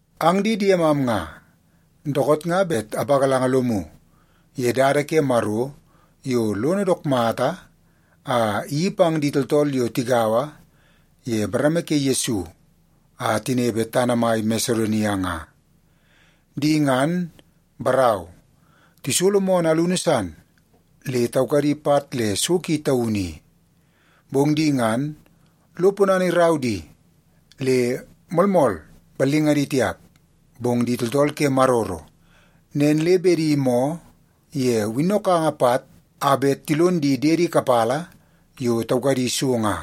Ang di diemam nga, dookoot nga bet apagalanga lomu ye dada ke Maro yo lono dook mata a iyeii pang di tooltool yo tigaua ye bareme ke Yesu a tinepe tana mai Masedonia nga. Di ngan, barau, tisolo moonoo alunu san le taukadi pat le so ki taunu i. Bong di ngan lo ponana irau di le moolmool ballingadi tiap, bong di tooltool ke maroro, nen le bedi moo ye winnokanga pat a bet tilon di diedi kapala yo taukadi so nga.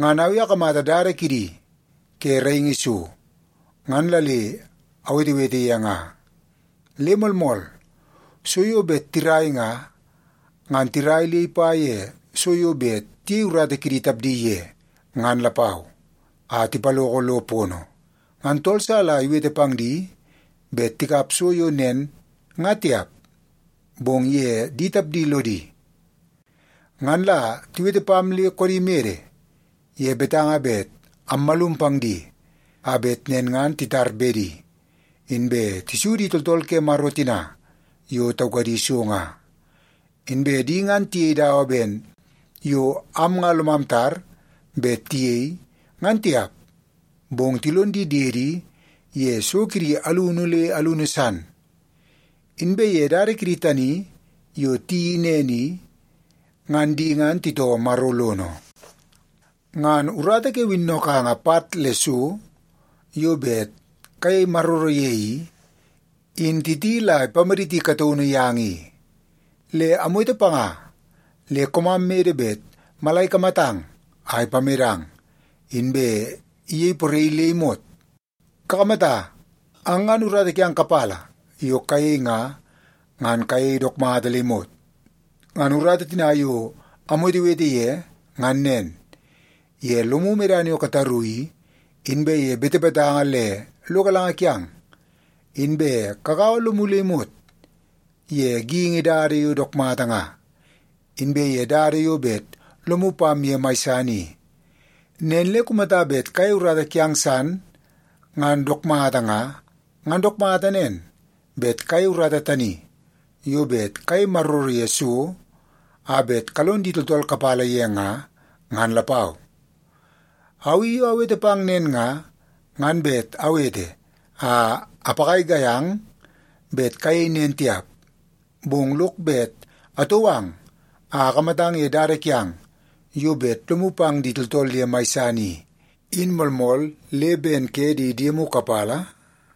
Ngan au i akamata dada kidi ke raingi so, ngan la le awetewete ye nga. Le moolmool, so yo bet tirai nga, ngan tirai le ipa ye so yo bet tiyei urata kidi tapdi ye, ngan lapau, a tipaloko lo pono. Ngan tool sa la iwete pang di bet tikap so yo nen nga tiap, bong ye di tapdi lodi. Ngan la tiwete pam le koodi mede ye betanga bet ammalum pang di, a bet nen ngan titar bedi, inbe tisu di tooltool ke Maro tina yo taukadi so nga. Inbe di ngan tiyei dawa ben yo am nga lomam tar bet tiyei, ngan tiap, bong tilon di diedi ye so kidi alunu le alunu san. Inbe ye dada kidi tani yo tiyeii nen i, ngan di ngan titoo Maro lono. Ngan urata ke winnokanga pat le so yo bet kayei maroro ye i, in Titi la ipamaditi kataunu yang i. Le amwete panga le koomam mede bet mala ikamatang a ipamedang, inbe iyei poraii le imot. Kakamata, ang ngan urata kiang kapala yo kayei nga, ngan kayei dook mata le imot. Ngan urata tina yo awetewete ye ngan nen; ye lomu medana yo kataru i, inbe ye betebetanga le lo galanga kiang, inbe kagaua lomu le imot ye geingi dada yo dook mata nga, inbe ye dada yo bet lomu pam ye mai san i. Nen le kumata bet kayei urata kiang san ngan dook mata nga, ngan dook mata nen, bet kayei urata tani yo bet kayei maroro ye so a bet kalon di tooltool kapala ye nga, ngan lapau. Au i yo awete pang nen nga, ngan bet awete a apagaigai ang bet kayei nen tiap. Bong lok bet atou ang a akamatang ye dada kiang yo bet lomu pang di tooltool ye mai san i, in moolmool le ben ke di diemu kapala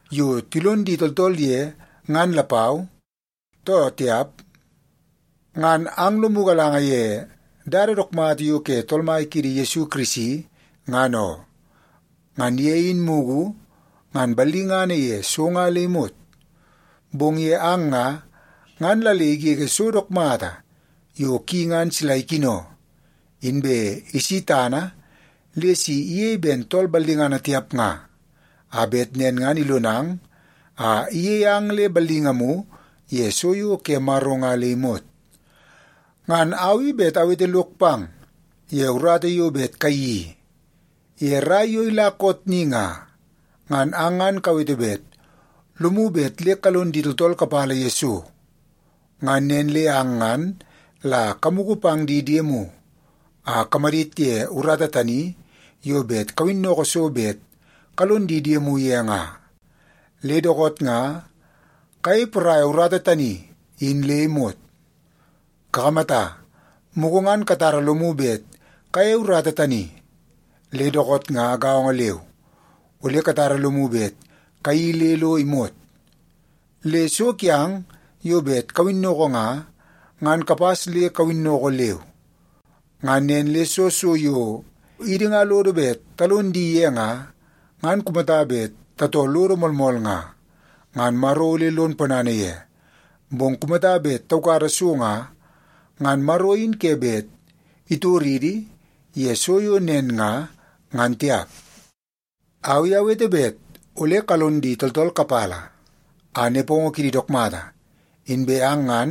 yo tilon di tooltool ye ngan lapau, too tiap. Ang ngan lomu galanga ye dada dook mata yo ke Tool Mai kiidi Yesu Kirisi, ngan oo. Ngan ye in mugu ngan ballingana ye so nga le imot, bong ye ang nga, ngan la le igege so dook mata yo ki ngan sila ikino, inbe isi tana le si iyei ben tool ballingana tiap nga, a bet nen ngan ilonang a iyei ang le ballingamu ye so yo ke Maro nga le imot. Ngan au i bet awete lok pang ye urata yo bet kayeii i. Ye rai yo ila koot ni nga, ngan ang ngan kawete bet lomu bet le kalon di tooltool kapala ye so, ngan nen le ang ngan la kamugu pang di diemu a kamadit ye urata tani yo bet kawinnoko so bet kalon di diemu ye nga. Le dookoot nga kayei poraia urata tani in le imot. Kakamata, mugu ngan katara lomu bet kayeie urata tani, le dookoot nga gaongo leu, ole katara lomu bet kayeii le lo imot. Le so kiang yo bet kawinnoko nga, ngan kapas le kawinnoko leu. Ngan nen le soo so yo idi nga lodo bet talon di ye nga, ngan kumata bet tatoo lodo moolmool nga, ngan Maro ole lon ponana ye. Bong kumata bet taukada so nga, ngan Maro in ke bet itoridi ye so yo nen nga, ngan tiap. Au i awete bet ole kalon di tooltool kapala a nepongo kidi dook mata, inbe ang ngan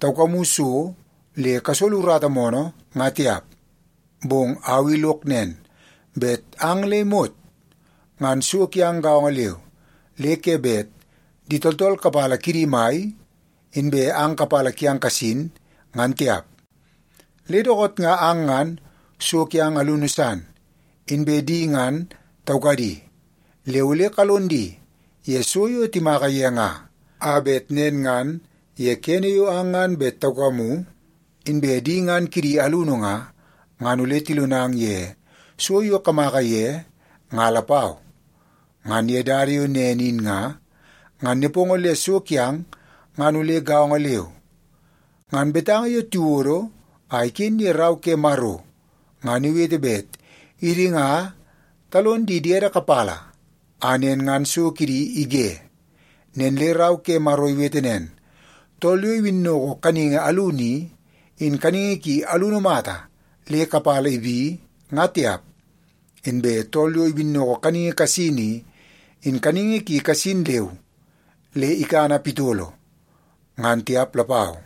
taukamu so le kasolo urata moonoo, nga tiap. Bong au i lok nen, bet ang le imot ngan so kiang gaongo leu, le ke bet di tooltool kapala kidi mai, inbe ang kapala kiang kasin, ngan tiap. Le dookoot nga ang ngan so kiang alunu san, inbe di ngan taukadi, le ole kalon di ye so yo timaka ye nga, a bet nen ngan ye kene yo ang ngan bet taukamu, inbe di ngan kidi alunu nga, ngan ole tilonang ye so yo kamaka ye nga lapau. Ngan ye dada yo nen in nga, ngan nepongo le so kiang ngan ole gaongo leu. Ngan betanga yo tiwodo a iken ye Rau ke Maro ngan iwete bet idi nga talon di diede kapala a nen ngan so kidi ige. Nen le Rau ke Maro iwete nen, “Tool yo iwinnoko kaningi alunu i, in kaningi ki alunu mata le kapala ibi, nga tiap. Inbe tool yo iwinnoko kaningi kasin i, in kaningi ki kasin leu le ikana pitolo, ngan tiap lapau.”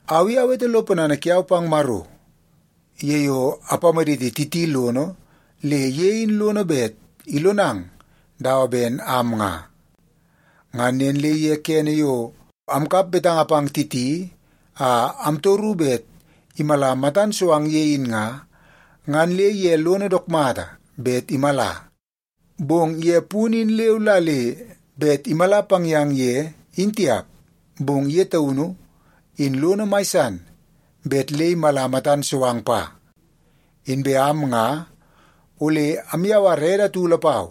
Au i awete lo ponana kiau pang Maro ye yo ipamaditi Titi lono le ye i lono bet ilonang dawa ben am nga. Ngan nen le ye kene yo amkap betanga pang Titi a amtoru bet imala matan so ang ye in nga, ngan le ye lono dook mata bet imala. Bong ye punu in leu la le bet imala pang yang ye, in tiap, bong ye taunu i lono mai san bet le imala matan so ang pa. Inbe am nga ole amyawara ede atu lapau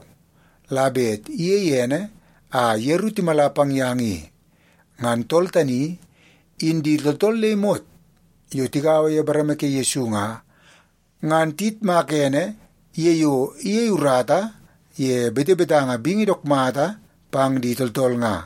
la bet iyei ene a yeru timala pang yang i. Ngan tool tani, in di tooltool le imot yo tigaua ye bareme ke Yesu nga, ngan tiyitmaka ene ye yo iyei urata ye betebetanga bingi dook mata pang di tooltool nga.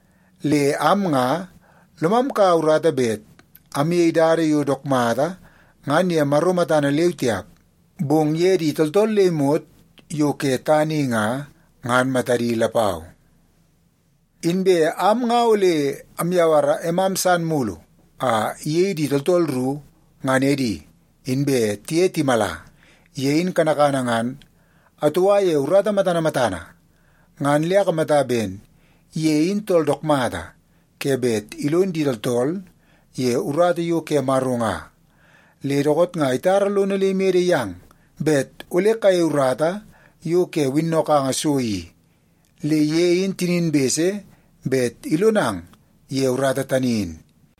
Le am nga lomam kaua urata bet amyei dada yo dook mata ngan ye Maro matana leu tiap, bong ye di tooltool le imot yo ke tana i nga, ngan matadi lapau. Inbe am nga ole amyawara emam san mulu a iyei di tooltool ru ngan edi inbe tiye timala. Ye in kanakana ngan atoua ye urata matana matana, ngan le akamata ben ye in tool dook mata ke bet ilon di tooltool ye urata yo ke Maro nga. Le dookoot nga itara lono le imede yang bet ole kayei urata yo ke winnokanga so i, le ye in tinin bese bet ilonang ye urata tani in.